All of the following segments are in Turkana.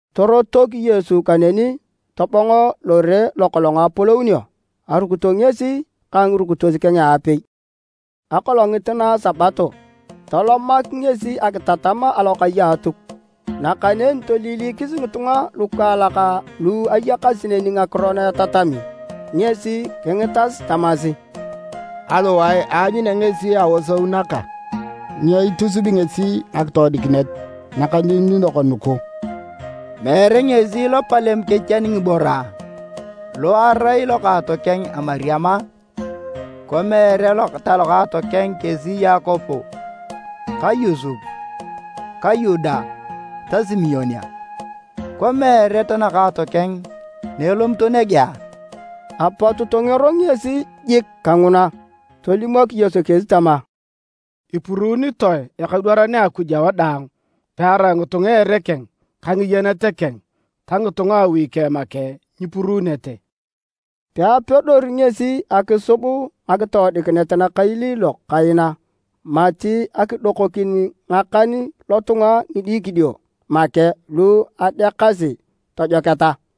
Torotok Yesu kaneni tobong lore lokolong apolounio. Arukito ngesi ka ngirukitos keng aapei. Akolongit na a Sabato, tolomak ngesi akitatam alokai a Atuk. Nakaneni toiliilikis ngitunga lukaalak lu ayakasi neni ngakiro na etatami ngesi kingitas tamasi, “Aliwae aanyunea ngesi aosou naga? Nyo itusubi ngesi ngakitoodikinet nakailiilok nugu? Meere ngesi lopalem kechian ngiboro, lo erai lokookeng a Mariam a? Ikwa meere talokaato keng kesi Yakobo ka Yosep ka Yuda ta Simon a? Ikwa meere tanakaato keng na elomito nege a?” Apot tongero ngesi jik kanguna. Tolimok Yesu kesi tama, “Ipuruunitoe ekadwaran a Akuj awadaang pearai ngitunga a ere keng ka ngiyenet keng ta ngitunga a awi keng make nyipuruunete.” Peapedori ngesi akisub ngakitoodikinet nakailiilok kaina mati akidokokin ngakan lotunga ngidikidio make lu adeakasi tojoketa.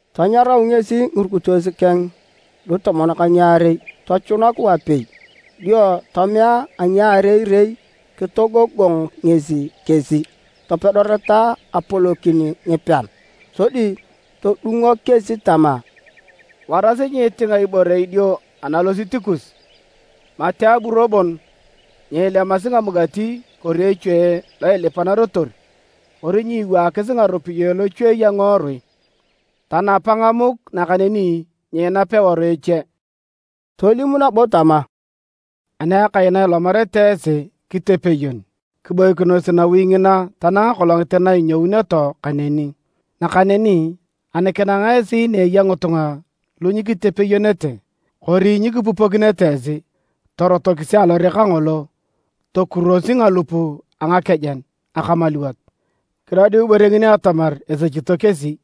Tanyarau ngesi ngirukitos keng lutomon ka ngiarei tochunak wapei dio tomea a ngaarei-rei. Kitogogong ngesi kesi topedoreta apolokin ngipean sodi todungok kesi tama, “Warasi nyiitinga ibore idio analosit kus, mati aburo bon nyiilemasi amugati kori echue lo ilipanarotor kori nyiiwaakis ngaropiyae lochuei a ngiworui. Tanapa ngamuk, nakaneni nyiinap eworu eche.” Tolim nabo tama, “Ani akai na ilomarete esi kitepeyon, kiboikinos nawi ngina tanang akolongit na inyouneto kaneni. Nakaneni ani kinang esi ni eya ngitunga lu nyikitepeyonete, kori nyikipupokinete esi, torotokisi alore kangolo tokurosi ngalup a ngakejen akamaluwot kidodiu ibore ngini atamar esechito kesi!”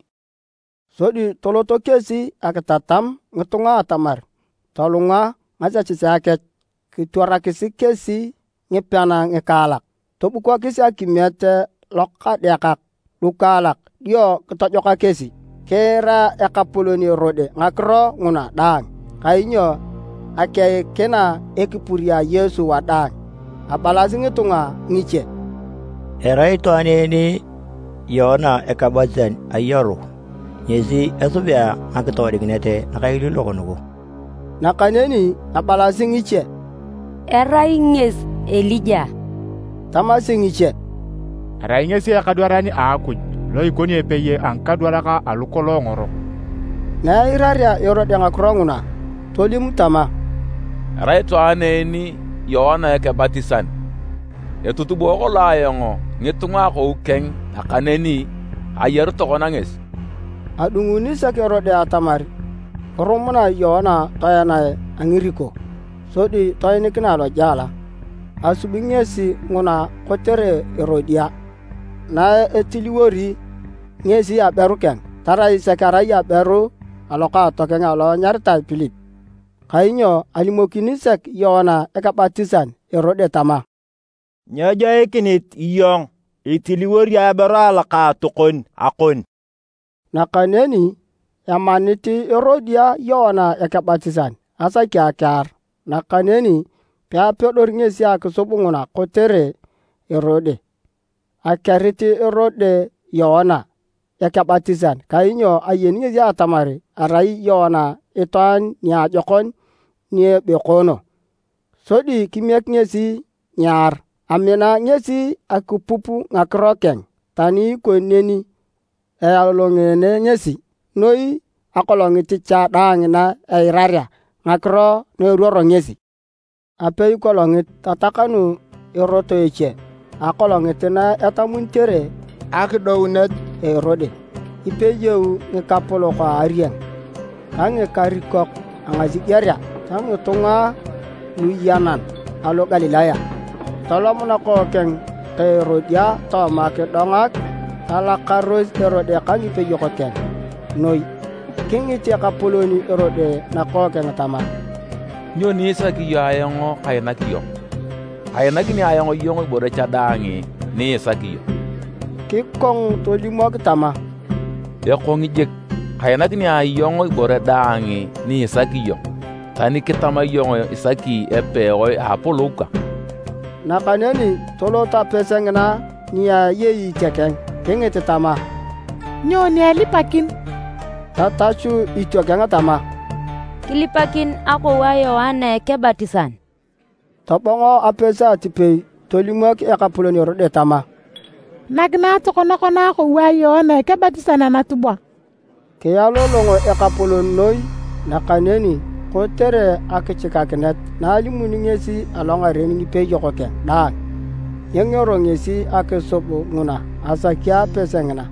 Sodi toloto kesi akitatam ngitunga atamar tolunga ngasechesea kech. Kitwarakis kesi ngipean ngikaalak. Tobukokis akimiet lokadeakak lukaalak dio kitojoka kesi. Kiira ekapolon Erode ngakiro nguna daang kainyo akeikina ekipur a Yesu wadaang. Abalasi ngitunga ngiche, “Erai itwaan en Yoana Ekebatisan ayaru, ngesi esubea ngakitoodikinet nakailiilok nugu.” Nakaneni abalasi ngiche, “Erai ngesi Elija.” Tamasi ngiche, “Erai ngesi ekadwaran a Akuj lo ikoni epei a ngikadwarak alu kolong ngorok.” Na eirarea Erode ngakiro nguna tolim tama, “Erai itwaan en Yoana Ekebatisan! Etutubo kolong ayong ngitunga akou keng nakaneni ayaru tokona ngesi!” Adunguni sek Erode atamar kirumunae Yoana toenae a ngiriko sodi toinikinae lojela. Asubi ngesi nguna kotere Erodia, na etiliwori ngesi aberu keng tarai sek arai aberu a lokaatokeng alo anyaritae Pilip. Kainyo alimokini sek Yoana Ekebatisan Erode tama, “Nyejoikinit iyong itiliwori aberu alokaatokon akon!” Nakaneni emanit Erodia Yoana Ekebatisan asaki akiar nakaneni peapedori ngesi akisub nguna kotere Erode. Akerit Erode Yoana Ekebatisan kainyo ayeni ngesi atamar arai Yoana itwaan niajokon ni ebekoono. Sodi kimiek ngesi nyear. Amina ngesi akipup ngakiro keng. Tani ikoni neni, ealolongeene ngesi noi akolongit cha daang na eirarea ngakiro na eruoro ngesi. Apeikolongit, tatakanu erot eche. Akolongit na etamunitere akidounet a Erode, kipeyou ngikapolok a arieng ka ngikarikok a ngasigerea ta ngitunga luyenan alo Galilaya. Tolom nakookeng ka Erodia tooma kidonga. Talakaros Erode ka ngipeyok keng noi. Kingit ekapolon Erode nakookeng tama, “Nyoni isaki iyong ayong kainak iyong? Kainakini ayong iyong ibore cha daang ni isaki iyong.” Kikong tolimok tama, “Ekong jik, kainakini iyong ibore daang ni isaki iyong, tani kitama iyong isaki epewae a apolou kang!” Nakaneni tolot apese ngina ni eyei itiokeng kingit tama, “Nyoni elipakin?” Tatachu itiokeng tama, “Kilipakin akou a Yoana Ekebatisan.” Tobongo apese atipei tolimok ekapolon Erode tama, “Nakinae tokona kona akou a Yoana Ekebatisan anatubwa.” Kialolong ekapolon noi, nakaneni kotere akichikakinet na alimuni ngesi alongaren ngipeyok keng daang, nyengero ngesi akisub nguna asaki apese ngina.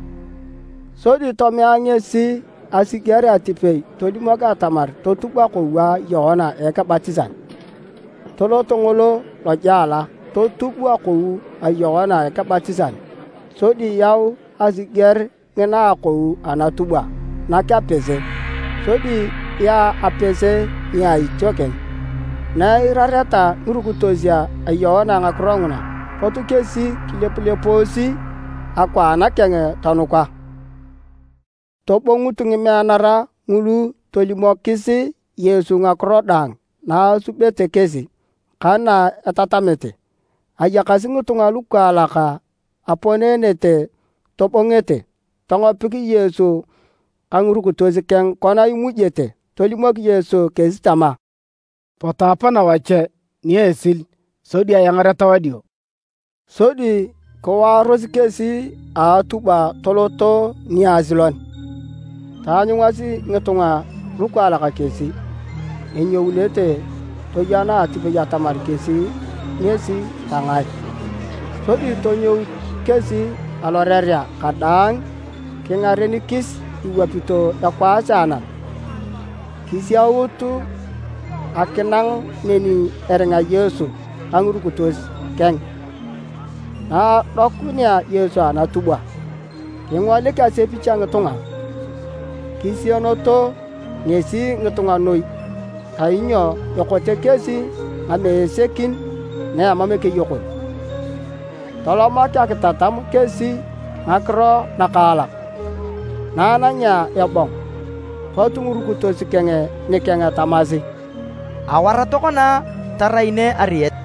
Sodi tomea ngesi asiger atipei tolimok atamar totub akou a Yoana Ekebatisan. Tolot ngolo lojela totub akou a Yoana Ekebatisan, sodi yau asiger ngina akou anatubwa nak apese, sodi yaa apese nia itiokeng. Na eirareta ngirukitos a Yoana ngakiro nguna, pot kesi kilepulepoosi akwaan keng, tonuka. Tobongut ngimeanara ngulu tolimokis Yesu ngakiro daang na asubete kesi ka na etatamete. Ayakasi ngitunga lukaalak aponeenete tobongete, tongopik Yesu ka ngirukitos keng kona imujete. Tolimok Yesu kesi tama, “Potu apana wache ni esil sodi eangareta wadio.” Sodi kiwaaros kesi a atubwa toloto niasilon. Taanyungasi ngitunga lukaalak kesi enyounete toyana atipei atamar kesi ngesi ta ngae. Sodi tonyout kesi alorerea kadaang kingarenikis iwapito ekwaas a anam, kisiaut akinang neni eringa Yesu ka ngirukitos keng. Na adokunea Yesu anatubwa kingolik asepich a ngitunga. Kisieneto ngesi ngitunga noi kainyo ekote kesi ngamesekin na emam ekeyokon. Tolomak akitatam kesi ngakiro nakaalak. Na anangea ebong, pot ngirukitos keng nikeng tamasi, “Awar tokona tarai nege ariet.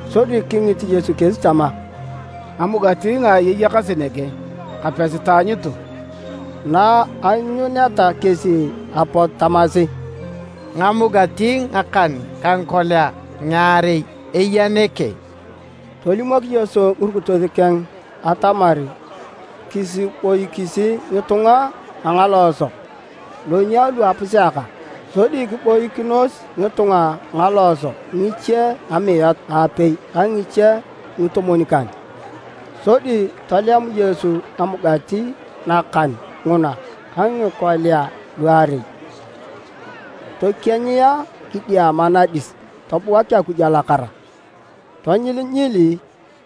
Sodi kingit Yesu kesi tama, “Ngamugati ngaai eyakasi nege, kapesi taanyutu.” Na aanyuneta kesi apot tamasi, “Ngamugati ngakan ka ngikolia ngiarei eya nege.” Tolimok Yesu ngirukitos keng atamar kisiboikis ngitunga a ngalooso lonyia lu apuseaka. Sodi kiboikinos ngitunga a ngalooso, ngiche amiat apei ka ngiche ngitomwon-kan. Sodi tolem Yesu ngamugati nakan nguna ka ngikolia luarei. Tokienyia kidiama nadis tobuak Akuj alakara. Tonyilinyili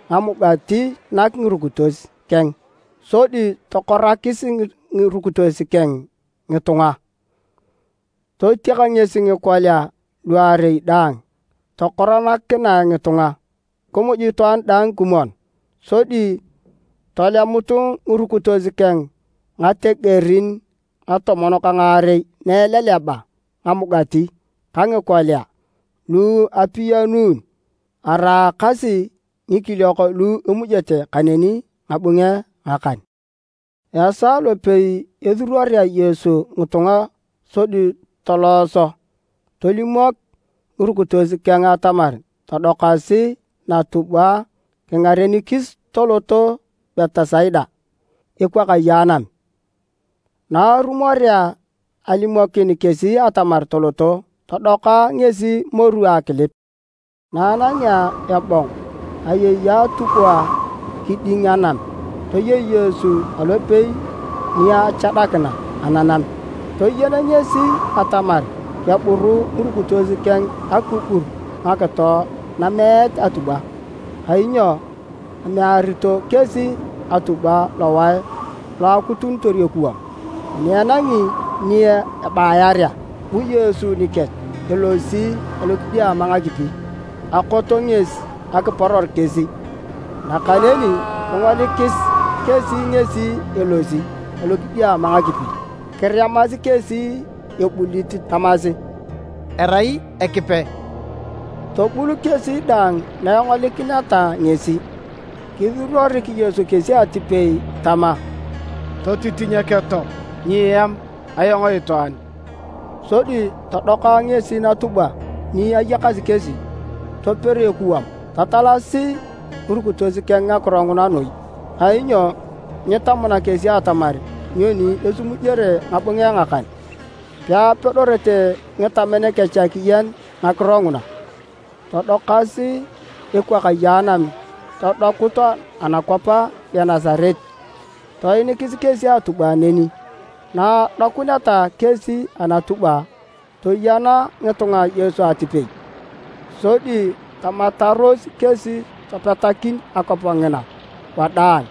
ngamugati nak ngirukitos keng sodi tokorakis ngirukitos keng ngitunga. Totiak ngesi ngikolia luarei dang tokoranakinae ngitunga. Kimuj itwaan daang kimwon. Sodi tolemut ngirukitos keng ngategerin ngatomon ka ngaarei na eleleba ngamugati ka ngikolia lu apiyanun. Araakasi ngikiliok lu emujete kaneni ngabunge ngakan. Esaa lopei esuruorea Yesu ngitunga sodi tolooso, tolimok ngirukitos keng atamar todokasi natubwa kingarenikis toloto Betisaida ekwakaye anam. Na arumorea alimokin kesi atamar toloto, todoka ngesi moru akilip. Na anangea ebong, ayei atubwa kiding anam toyei Yesu alopei ni achadakina ananam. Toyen ngesi atamar keburu ngirukitos keng akigur ngakito nameet atubwa, kainyo amearito kesi atubwa lowae lo akutunitor ekuwam. Ani enangi ni abaiarea, bu Yesu nikech elosi alokidiama ngakipi. Akot ngesi akiporor kesi, nakaneni kingolikis kesi ngesi elosi alokidiama ngakipi. Kiremasi kesi ebulit tamasi, “Erai Ekipe!” Tobul kesi daang na engolikineta ngesi. Kisuruorik Yesu kesi atipei tama, “Totitinyeketo! Nyieam! Ayong itwaan!” Sodi todoka ngesi natubwa ni ayakasi kesi, toper ekuwam. Tatalasi ngirukitos keng ngakiro nguna noi, kainyo nyitamuna kesi atamar nyoni esimujere ngabunge ngakan. Peapedorete ngitamen kech akiyen ngakiro nguna. Todokasi ekwakaye anam todokut anakwap a Genesaret. Toinikis kesi atubwa neni. Na adokuneta kesi anatubwa, toyena ngitunga Yesu atipei. Sodi tamataros kesi topetakin akwap ngina wadaang.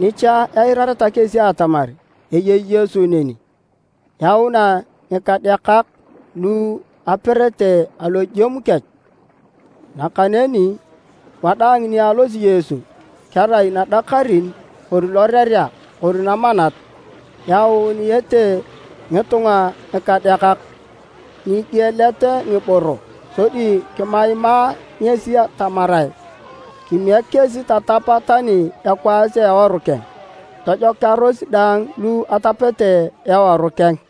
Nicha eirareta kesi atamar eyei Yesu neni, yaunae ngikadeakak lu eperete alojem kech. Nakaneni wadaang ni alosi Yesu kerai nadakarin kori lorerea kori namanat, ayaunete ngitunga ngikadeakak nigielet ngiboro sodi kimaimae ngesi tamarae kimiek kesi tatapa tani ekwaas a eworu keng. Tojokearos daang lu atapete eworu keng.